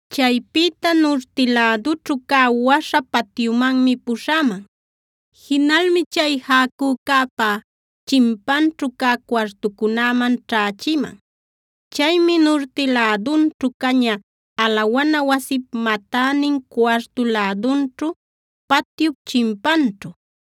Chaypïta nurti lädućhu cä waśha patyumanmi puśhäman. Jinalmi chay jäcücäpa chimpanćhu cä cuartucunäman ćhächiman. Caymi nurti lädunćhu caña, alawana wasip matänin cuartu lädunćhu, patyup chimpanćhu.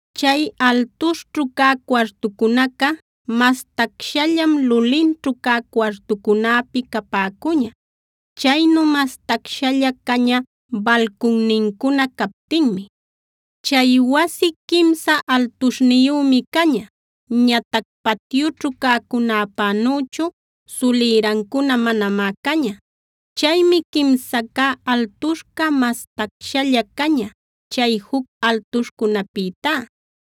Chay altuśhćhu cä cuartucunaca mas tacshallam lulinćhu cä cuartucunäpi capäcuña. Chaynu mas tacshalla caña balcunnincuna captinmi. Chay wasi quimsa altuśhniyümi caña. Ñatac patyućhu cäcunäpänüchu sulïrancuna manamá caña. Chaymi quimsa cä altuśhca mas tacshalla caña, chay juc altuśhcunäpïtá.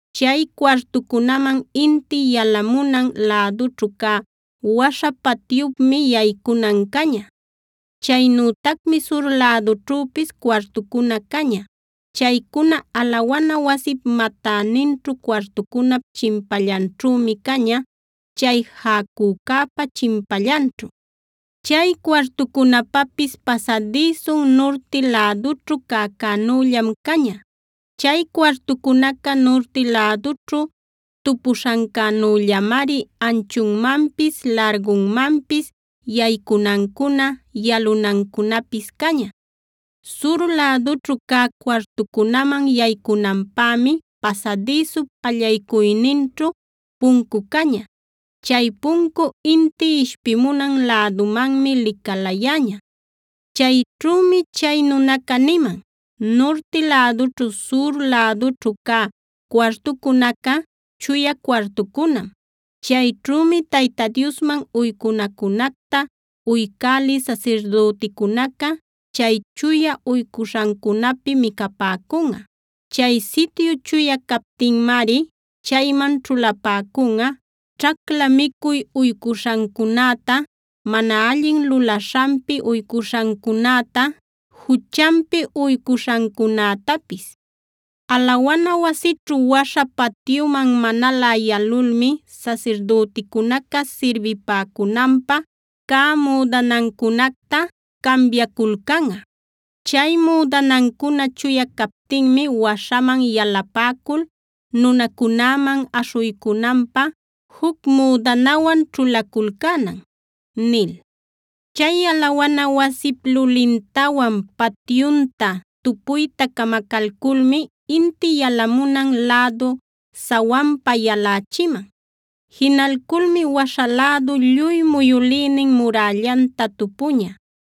Chay cuartucunaman inti yalamunan lädućhu cä waśha patyupmi yaycunan caña. Chaynütacmi sur lädućhüpis cuartucuna caña. Chaycuna alawana wasip matäninćhu cuartucunap chimpallanćhümi caña, chay jäcücäpa chimpallanćhu. Chay cuartucunapapis pasadïsun nurti lädućhu cäcänüllam caña. Chay cuartucunaca nurti lädućhu tupuśhancänüllamari anchunmanpis, largunmanpis, yaycunancuna, yalunancunapis caña. Sur lädućhu cä cuartucunaman yaycunanpämi pasadïsup allaycuyninćhu puncu caña. Chay puncu inti ishpimunan lädumanmi licalayäña. Chayćhümi chay nunaca niman: “Nurti lädućhu, sur lädućhu cä cuartucunaca chuya cuartucunam. Chayćhümi Tayta Diosman uycunacunacta uycälï sasirdüticunaca chay chuya uycuśhancunapi micapäcunꞌa. Chay sityu chuya captinmari chayman ćhulapäcunꞌa: ćhacla micuy uycuśhancunäta, mana allin lulaśhanpi uycuśhancunäta, juchanpi uycuśhancunätapis. Alawana wasićhu waśha patyuman manalä yalulmi sasirdüticunaca sirbipäcunanpä cä müdanancunacta cambiaculcanꞌa. Chay müdanancuna chuya captinmi waśhaman yalapäcul nunacunäman aśhuycunanpä juc müdanawan ćhulaculcänan” nil. Chay alawana wasip lulintawan patyunta tupuyta camacalculmi inti yalamunan lädu sawanpa yalächiman. Jinalculmi waśha lädu lluy muyülïnin murällanta tupuña.